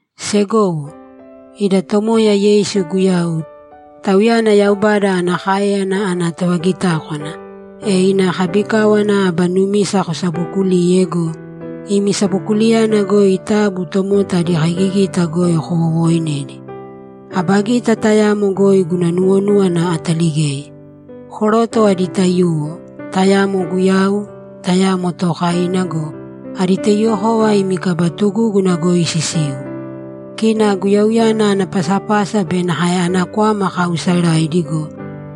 Segowo, ida Tomoya Yeisu Guyau, Tauyana Yaubada ana káeyana ana tovagitákwana, e ina kabikáwana aba numisa kosabookulīye go, imi sabokuliyana goi taabu tomota adi kaigigita goi kowowooinēdi. Aba gita tayamo goi guna nuwonúwana ataligei. Koroto adi taiyuwo, tayamo guyau, tayamo tookaina go, adi taiyuwokova imi kaba tugúguna goi sisiu. Kina guyauyana ana pasapasa be nakae ana kwama kaausaraidi go,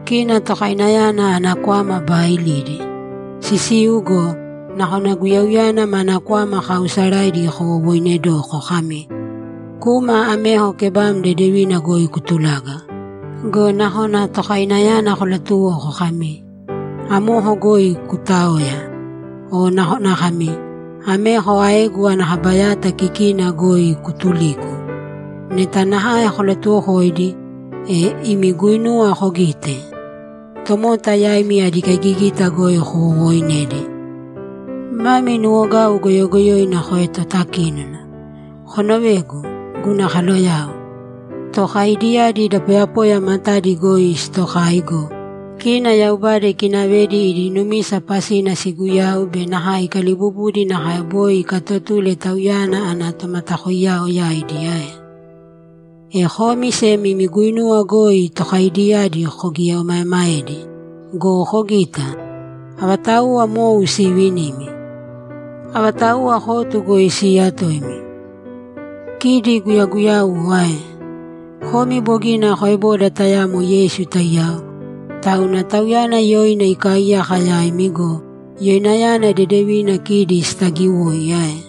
kina tokainayana ana kwama baailidi. Sisiu go, nakona guyauyana mana kwama kaausaraidi kowowoinedoko kami, ‘Kūma ameko kebam dedevina goi kutulāga.’ Go nakona tokainayana kolatuwoko kami, ‘Amoko goi kuutāoya.’ O nakona kami, ‘Ameko aegu ana kaba yata kikina goi kutulīku.’ Neta nakae kolatuwokoidi, e imi guinuwa kogite? Tomota yaimi adi kaigigita goi kowowoinedi. Mami nuwogau goyogoyoina koetotakínona. Konovēgu, guna kaloyao! Tookaidiyadi da poyapoya matadi goi sitokai go, kina Yaubada ikinavedi idi numisa pasina siguyau be nakae ikalibubudi nakae boi ikaatotule Tauyana ana tomatakoiyao yaidi ae? E komi sem imi guinuwa goi tookaidiyadi kogieomaemaedi! Go kogita! Avatauwa mou siivinimi? Avatauwa kotu goi siiyatoimi? Kidi guyaguyauwo ae? Komi bogina koeboda tayamo Yeisu taiyao, tauna Tauyana yoina ikaaiyaka yaimi go, yoinayana dedevina kidi sitaagiwoi ae?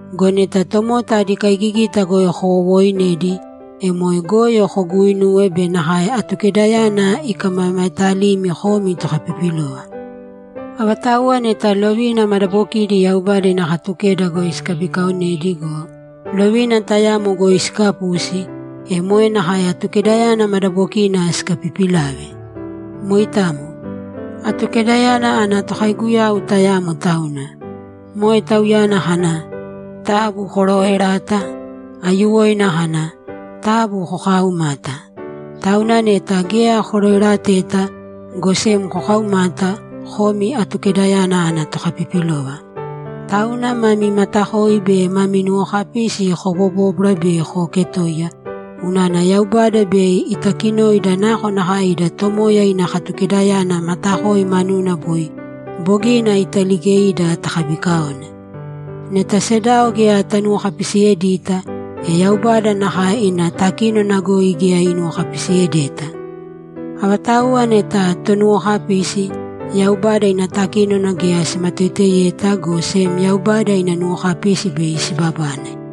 Go neta tomota adi kaigigita goi kowowooinedi, e moe goyo koguuinuwe be nakae Atukedayana ikamamaetalimi komi tokapipilova. Avatauwa neta lovina madabokidi Yaubada ina Katukeda goi sikabikaonedi go, lovina tayamo goi sikapusi, e moe nakae Atukedayana madabokina sikapipilave. Moitamo. Atukedayana ana Tokaiguyau tayamo tauna. Moe Tauyana kana, ‘Taabu korooerāta.’ Aiyuwoina kana, ‘Taabu kokaaumāta.’ Tauna neta geya koroerateta, go sem kokaumata, komi Atukedayana ana tokapipilova. Tauna mami matakoi be mami nuwokapisi kobobōbwara be kooketōiya, unana Yaubada bei itakinoida nakonakae ida Tomoya ina Katukedayana matakoi manuna boi bogina italiigeida takabikaone. Neta sedao geya tanuwokapisiyedita, e Yaubada nakae ina takínona goi geya inuwokapisiyedeta. Avatauwa neta tonuwokapisi, Yaubada ina takínona geya simatoiteyeta, go sem Yaubada ina nuwokapisi bei sibabane.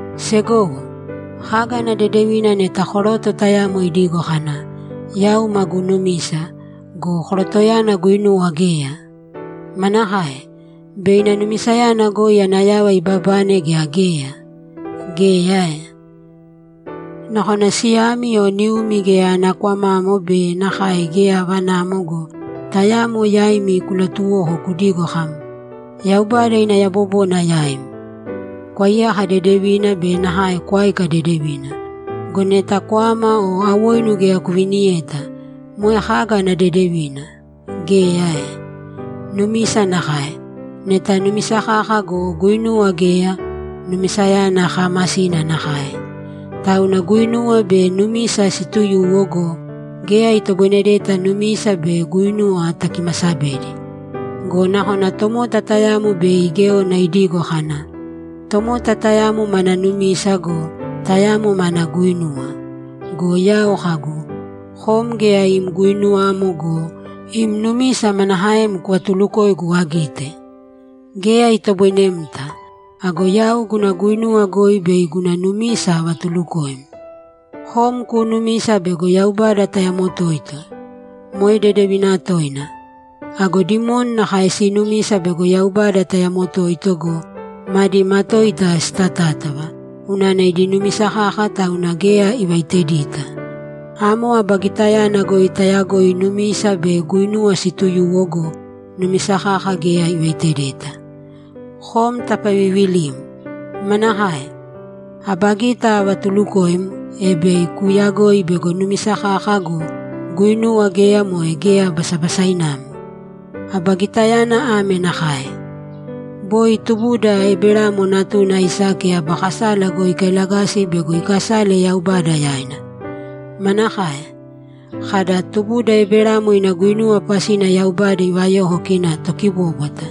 Segowo, kaga ana dedevina neta koroto tayamo idigo kana, ‘Yau magu numisa’ go, korotoyana guinuwa geya? Manakae? Bei ina numisayana goi ana yava ibabane gea geya? Geya ae? Nakona siyami o niumi geya ana kwamamo be nakae geya avanamo go, tayamo yaimi kulatuwoko kudigo kam, ‘Yaubada ina yabobona yaim. Kwaiyāka dedevina be nakae kwāika dedevina.’ Go neta kwama o awoinu geya kuviniyeta, moe kaga ana dedevina? Geya ae? Numisa nakae. Neta numisa kaka go, guinuwa geya, numisayana kaamasina nakae. Tauna guinuwa be numisa siituyuwo go, geya itoboinedeta numisa be guinuwa takimasabedi. Go nakona tomota tayamo bei igéona idigo kana, ‘Tomota tayamo mana numisa go, tayamo mana guinuwa.’ Go yau kagu, ‘Kom geya im guinuwamo go, im numisa manakaem kuvatulukoigu agite? Geya itoboinemta! Ago yau guna guinuwa goi bei guna numisa avatulukoim.’ Kom kuunumisa bego Yaubada tayamo toito; moe dedevina toina. Ago dimoni nakae siinumisa bego Yaubada tayamo toito go, madi matoita sitátava, unana idi numisa kaka tauna geya ivaitedita! Amo aba gitayana goi tayagoi numisa be guinuwa siituyuwo go, numisa kaka geya ivaitedeta. Kom tapaviivilim! Manakae? Aba gita avatulukoim, e bei kuuyagoi bego numisa kaka go, guinuwa geya moe geya basabasainamo? Aba gitayana ame nakae: Boi tubuda Eberamo natuna Aisake aba kasala goi ikailagasi bego ikasale Yaubada yaina. Manakae? Kada, ‘Tubuda Eberamo ina guinuwa pasina Yaubada ivayoko kina tokibóbwata’?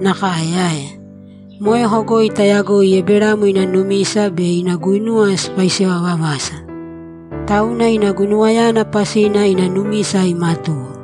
Nakae ae? Moeko goi tayagoi Eberamo ina numisa be ina guinuwa sipaisewa vavasa. Tauna ina guinuwayana pasina ina numisa imatuwo.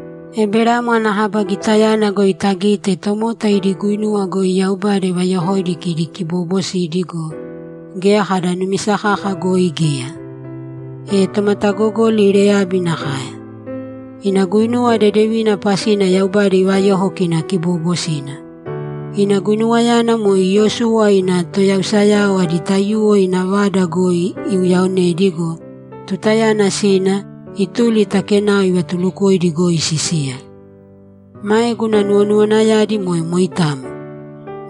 Eberamo ana kaba gitayana goi tagite tomota idi guinuwa goi Yaubada ivayokoidi kidi kiboobosidi go, geya kada numisa kaka goi geya. E tomatagogoli Reyabi nakae. Ina guinuwa dedeviina pasina Yaubada ivayoko kina kiboobosina. Ina guinuwayana moe Iyosuwa ina toyausayao adi taiyuwo ina vada goi iuyaonedi go, tutayana sina, ituli ta kenao ivatuulukoidi goi sisiya. Mae guna nuwonuwanayadi moe moitamo.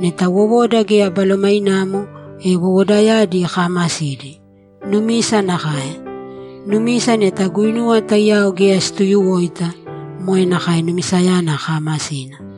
Neta wowoda geya balomainamo, e wowodayadi kaamasidi. Numisa nakae. Numisa neta guinuwa taiyao geya situyuwoita, moe nakae numisayana kaamasina.